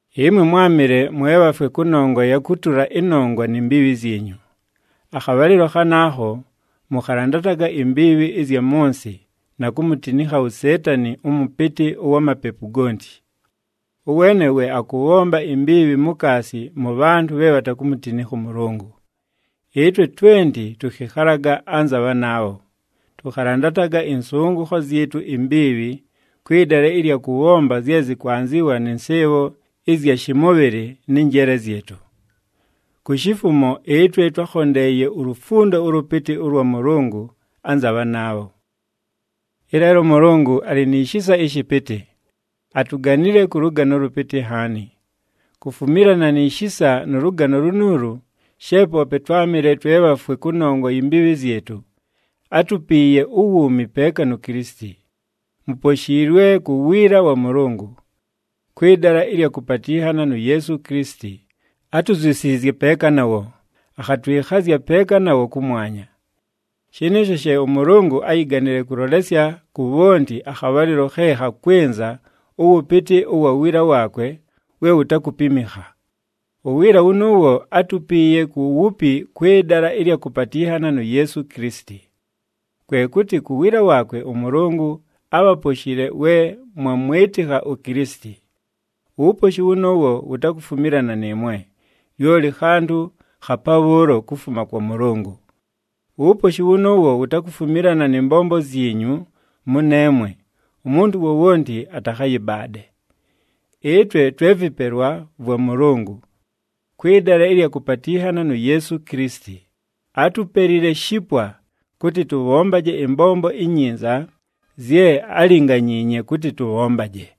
Ɨmwe mwámɨle mwe bhafwe kʉnongwa ya kʉtʉla ɨnongwa ni mbiibhi zyinyu. Akhabhalɨlo khanaakho, mʉkhalandataga imbiibhi ɨzya mʉ nsɨ na kumutinikha uSeetani, ʉmʉpɨtɨ ʉwa mapepu gonti. Ʉweene we akʉbhomba imbiibhi mukaasi mʉ bhantʉ bhe bhatakumutinikha ʉMʉlʉngʉ. Ɨtwe twenti tʉkhɨkhalaga anza bhanaabho. Tʉkhalandataga ɨnsʉngʉkho zyɨtʉ imbiibhi, kwɨ dala ɨlya kʉbhomba zye zɨkwanzɨwa nɨ nsɨɨbho ɨzya shɨmʉbhɨlɨ nɨ njeele zyɨtʉ. Ku shifumo ɨtwe twákhondeeye ulufundo ʉlʉpɨtɨ ʉlwa Mʉlʉngʉ anza bhanaabho. Ɨleelo ʉMʉlʉngʉ alɨ ni shisa ɨshɨpɨtɨ. Atuganile kʉ lʉgano ʉlʉpɨtɨ nhaani. Kufumilana ni shisa nʉ lʉgano lunuulu, she poope twámɨle twe bhafwe kʉnongwa yi mbiibhi zyɨtʉ, átupiiye uwuumi peeka nu Kilisiti. Muposhiilwe ku wiila wa Mʉlʉngʉ. Kwɨ dala ɨlya kʉpatɨnhana nu Yeesu Kilisiti, átuzyusiizye peeka nawo, akhatwɨkhazya peeka nawo kʉmwanya. Shɨnɨɨsho she ʉMʉlʉngʉ áyiganile kʉlolesya ku bhonti akhabhalɨlo khe khakwɨnza ʉwʉpɨtɨ ʉwa wiila waakwe we wutakupimikha. Uwiila wʉnʉʉwo átupiiye ku wupi kwɨ dala ɨlya kʉpatɨnhana nu Yeesu Kilisiti. Kwe kʉtɨ ku wiila waakwe ʉMʉlʉngʉ ábhaposhile we mwamwɨtɨkha uKilisiti. Uwuposhi wʉnʉʉwo wutakufumilana nɨɨmwe, lyoli khantʉ kha pabhʉʉlo kufuma kwa Mʉlʉngʉ. Uwuposhi wʉnʉʉwo wutakufumilana nɨ mbombo zyinyu mʉneemwe, umuntu wowonti atakhayɨbaade. Ɨtwe twe vɨpelwa vwa Mʉlʉngʉ. Kwɨ dala ɨlya kʉpatɨnhana nu Yeesu Kilisiti, átupelile shipwa kʉtɨ tʉbhombaje ɨmbombo inyinza zye álinganyiinye kʉtɨ tʉbhombaje.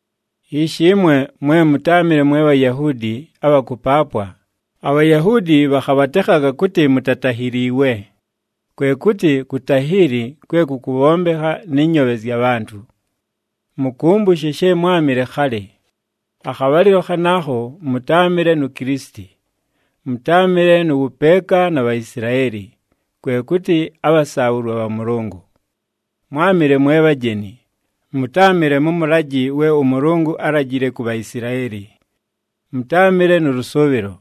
Ishi ɨmwe mwe mʉtáamɨle mwe Bhayahuudi abha kʉpaapwa, aBhayahuudi bhakhabhatekhaga kʉtɨ mutatahiliiwe, kwe kʉtɨ kutahiili kwe kʉkʉbhombekha nɨ nyoobhe zya bhantʉ. Mʉkʉmbʉshe she mwámɨle khalɨ. Akhabhalɨlo khanaakho mʉtáamɨle nu Kilisiti, mʉtáamɨle nʉ wʉpeeka na Bhaisilaeli, kwe kʉtɨ abhasaabhʉlwa bha Mʉlʉngʉ. Mwámɨle mwe bhajeni, mʉtáamɨle mʉ mʉlajɨ we ʉMʉlʉngʉ álajile ku Bhaisilaeli. Mʉtáamɨle nʉ lʉsʉʉbhɨlo.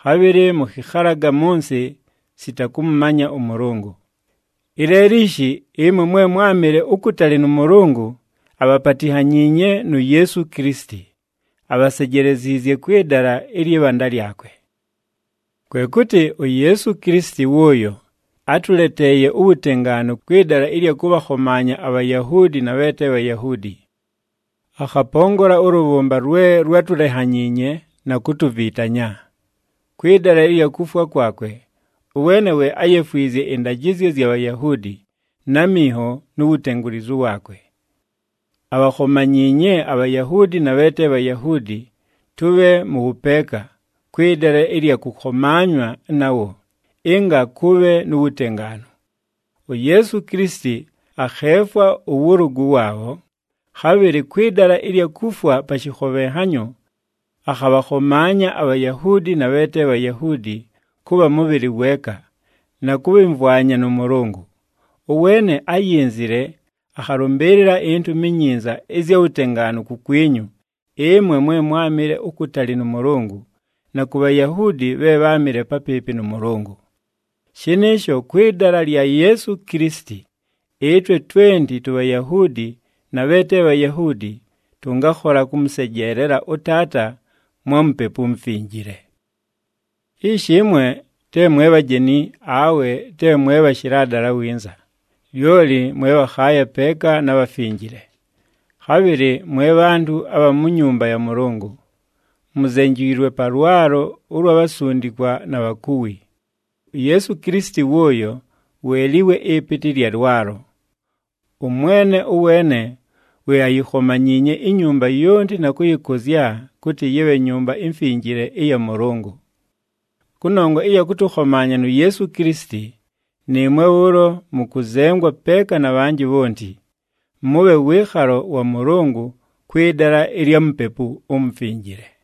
Khabhɨlɨ mʉkhɨkhalaga mʉ nsɨ sita kʉmʉmanya ʉMʉlʉngʉ. Ɨleelo ishi, ɨmwe mwe mwámɨle ukutali nʉ Mʉlʉngʉ, abhapatinhanyiinye nu Yeesu Kilisiti, abhasejeleziizye kwɨ dala ɨlyɨ bhanda lyakwe. Kwe kʉtɨ, uYeesu Kilisiti wʉʉyo átʉleteeye uwutengaanu kwɨ dala ɨlya kʉbhakhomaanya aBhayahuudi na bhe te Bhayahuudi. Akhapongola ʉlʉbhʉmba lwe lwátulenhanyiinye na kutuvitanya. Kwɨ dala ɨlya kufwa kwakwe, ʉweene we áyefwizye ɨndajɨzyo zya Bhayahuudi, na minho nu wutengulizu waakwe. Abhakhomanyiinye aBhayahuudi na bhe te Bhayahuudi tʉbhe mʉ wʉpeeka, kwɨ dala ɨlya kʉkhomaanywa nawo, ɨnga kʉbhe nu wutengaanu. UYeesu Kilisiti akheefwa ʉwʉlʉgʉ waabho, khabhɨlɨ kwɨ dala ɨlya kufwa pa shɨkhobhenhanyo, akhabhakhomaanya aBhayahuudi na bhe te Bhayahuudi kʉbha mʉbhɨlɨ weeka, na kʉbhɨmvwanya nʉ Mʉlʉngʉ. Ʉweene áyinzile akhalʉmbɨɨlɨla iNtumi iNyinza ɨzya wutengaanu kukwinyu ɨmwe mwe mwámɨle ukutali nʉ Mʉlʉngʉ na ku Bhayahuudi bhe bháamɨle papɨɨpɨ nʉ Mʉlʉngʉ. Shɨnɨɨsho, kwɨ dala lya Yeesu Kilisiti, ɨtwe twenti tuBhayahuudi na bhe te Bhayahuudi, tʉngakhola kʉmʉsejeelela ʉTaata mwa Mupepu uMufinjile. Ishi, ɨmwe te mwe bhajeni awe te mwe bhashɨla dala winza, lyoli mwe bhakhaaya peeka na bhafinjile, khabhɨlɨ mwe bhantʉ abha mu nyumba ya Mʉlʉngʉ. Muzenjiilwe pa lwalo ʉlwa bhasundikwa na bhakuwi. UYeesu Kilisiti wʉʉyo we liwe ɨpɨtɨ ɨlya lwalo. ɄMwene ʉweene we ayikhomanyiinye inyumba yonti na kʉyɨkʉzya kʉtɨ yɨbhe Nyumba iMfinjile ɨya Mʉlʉngʉ. Kʉnongwa ɨya kʉtʉkhomaanya nu Yeesu Kilisiti, nɨɨmwe bhʉʉlo mʉkʉzengwa peeka na bhanjɨ bhonti, mʉbhe wɨɨkhalo wa Mʉlʉngʉ kwɨ dala ɨlya Mupepu uMufinjile.